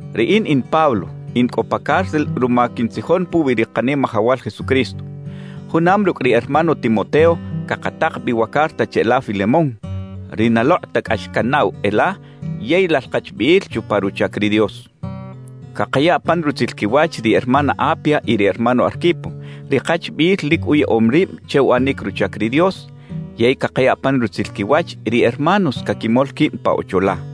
Riꞌin in Pablo, in cꞌo pa cárcel ruma quintzijon puwi ri Kanimajawal Jesucristo. Junam rucꞌ ri hermano Timoteo cakatak bi wa carta cheꞌla Filemón, ri na lokꞌ ta cꞌax canaꞌw e la yey lal kachbiꞌil chupa ruchac ri Dios. Cakaya pan rutzil quiwach ri hermana Apia y ri hermano Arquipo, ri kachbiꞌil lic uyaꞌom rib che uꞌanic ruchac ri Dios, yey cakaya pan rutzil quiwach ri hermanos caquimol quib pa ocho la.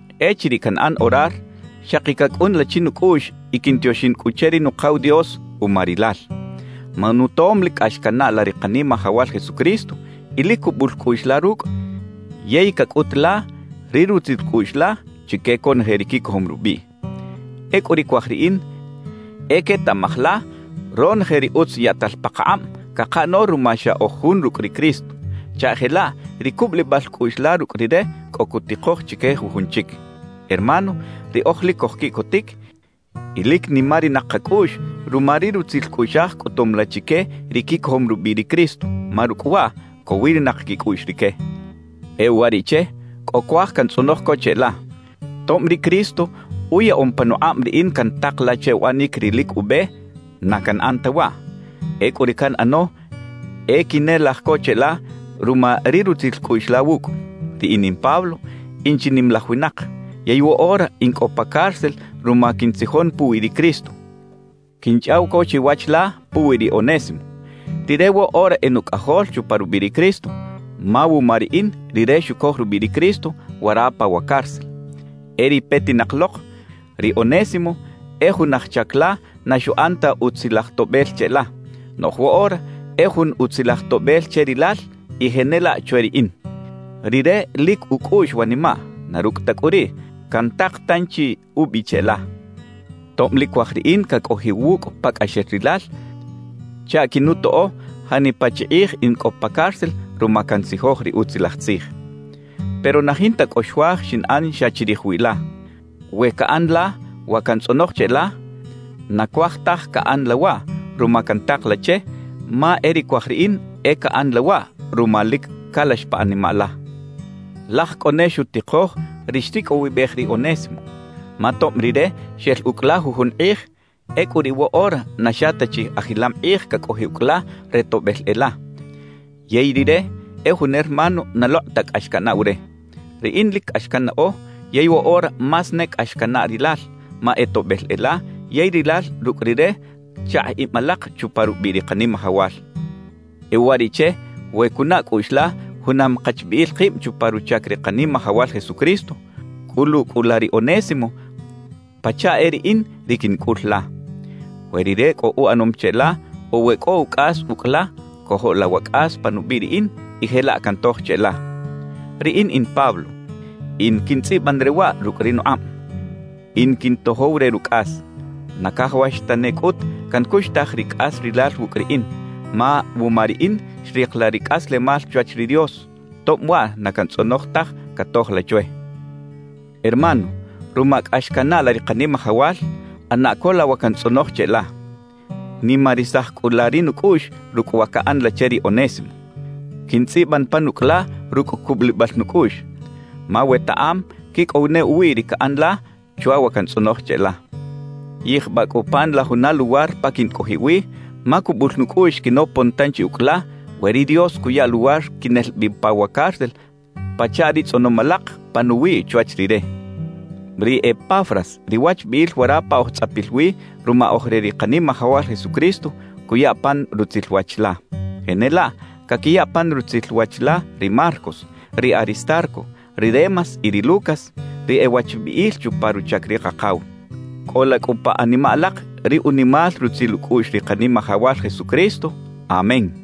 Echiriꞌ canꞌan orar, xaki cacꞌun la chi nucꞌuꞌx y quintioxin cꞌu che ri Nukaw Dios uma rilal. Ma nutom lic cꞌax canaꞌ la ri Kanimajawal Jesucristo y lic cubul cꞌuꞌx la rucꞌ yey cacꞌut la ri rutzil cꞌuꞌx la chique conoje ri quicojom rubiꞌ. Ecꞌu ri cuaj riꞌin e quetaꞌmaj la ronoje ri utz yaꞌtal pakakꞌab cakaꞌano ruma xa oj jun rucꞌ ri Cristo, chaꞌ jelaꞌ ri cubulibal cꞌuꞌx la rucꞌ Rire cꞌo cutikoj chique jujun chic. Hermano, riꞌoj lic cojquiꞌcotic y lic nimarinak kacꞌuꞌx ruma ri rutzil cꞌuꞌxaj cꞌutum la chique ri quicojom rubiꞌ ri Cristo, ma rucꞌ waꞌ cowirinak quicꞌuꞌx rique. E uwariꞌche, cꞌo cuaj cantzꞌonoj co cheꞌla. Tob ri Cristo uyaꞌom panukꞌab riꞌin cantak la che uꞌanic ri lic ube, na canꞌan ta waꞌ; ecꞌu ri canꞌano e quinelaj co cheꞌla ruma ri rutzil cꞌuꞌx la wucꞌ. Riꞌin in Pablo, in chi nimalaj winak, yey woꞌora in cꞌo pa cárcel ruma quintzijon puwi ri Cristo; quinchꞌaw co chiwach la puwi ri Onésimo. Rire woꞌora e nucꞌajol chupa rubiꞌ ri Cristo, ma wuma riꞌin, rire xucoj rubiꞌ ri Cristo wara pa wa cárcel. E ri petinak lok, ri Onésimo e jun aj chac la na xuꞌan ta utzilaj toꞌbel cheꞌla, noꞌj woꞌora e jun utzilaj toꞌbel che rilal y jenelaꞌ chwe riꞌin. Rire lic ucꞌuꞌx wanimaꞌ; na rucꞌ ta cꞌu riꞌ, cantak tanchi ubi cheꞌla, tob lic cuaj riꞌin cacꞌojiꞌ wucꞌ pacꞌaxel rilal chaꞌ quinutoꞌo janipa chi kꞌij in cꞌo pa cárcel ruma cantzijoj ri Utzilaj Tzij. Pero na jinta cꞌo xuaj xinꞌan xa chirij wiꞌ la. We caꞌan la wa cantzꞌonoj cheꞌla, na cuaj taj caꞌan la waꞌ ruma cantak la che, ma e ri cuaj riꞌin e caꞌan la waꞌ ruma lic calax pa animaꞌ la. Laj cꞌo ne xutikoj ri xricꞌowibej ri Onésimo, ma tob rire xel ucꞌ la jujun kꞌij, ecꞌu riꞌ woꞌora na xa ta chi ajilam kꞌij cacꞌojiꞌ ucꞌ la re toꞌbel e la, yey rire e jun hermano na lokꞌ ta cꞌax canaꞌw re. Riꞌin lic cꞌax cannaꞌo yey woꞌora más ne cꞌax canaꞌ rilal, ma e toꞌbel e la, yey rilal rucꞌ rire chakꞌ ib alak chupa rubiꞌ ri Kanimajawal. E uwariꞌche, we cunaꞌ cꞌuꞌx la junam kachbiꞌil kib chupa ruchac ri Kanimajawal Jesucristo, cꞌulu cꞌu la ri Onésimo pachaꞌ e riꞌin ri quincꞌul la. We rire cꞌo uꞌanom cheꞌla o we cꞌo ucꞌas ucꞌ la, cojo la wa cꞌas pa nubiꞌ riꞌin y jelaꞌ cantoj cheꞌla. Riꞌin in Pablo, in quintzꞌiban re waꞌ rucꞌ ri nukꞌab: In quintojow re rucꞌas. Na cajawax tane cꞌut cancuxtaj ri cꞌas rilal wucꞌ riꞌin, ma wuma riꞌin xrik la ri cꞌaslemal chwach ri Dios, tob waꞌ na cantzꞌonoj taj catoj la chwe. Hermano, ruma cꞌax canaꞌ la ri Kanimajawal; ꞌana co la wa cantzꞌonoj cheꞌla. Nimarisaj cꞌu la ri nucꞌuꞌx rucꞌ wa caꞌan la che ri Onésimo. Quintzꞌiban pan ucꞌ la rucꞌ cubulibal nucꞌuꞌx, ma wetaꞌam quicꞌow ne uwiꞌ ri caꞌan la chwa wa cantzꞌonoj cheꞌla. Yijbaꞌ cꞌu pan la juna luwar pa quincꞌojiꞌ wi, ma cubul nucꞌuꞌx quinopon tanchi ucꞌ la, we ri Dios cuya luwar quinel bi pa wa cárcel pachaꞌ ri tzꞌonom alak panuwiꞌ chwach Rire. Ri Epafras, ri wachbiꞌil wara pa oj tzꞌapil wi ruma oj re ri Kanimajawal Jesucristo, cuya pan rutzil wach la. Jenelaꞌ, caquiya pan rutzil wach la ri Marcos, ri Aristarco, ri Demas y ri Lucas, ri e wachbiꞌil chupa ruchac ri Kakaw. Cꞌola cꞌu pa animaꞌ alak ri unimal rutzil ucꞌuꞌx ri Kanimajawal Jesucristo. Amén.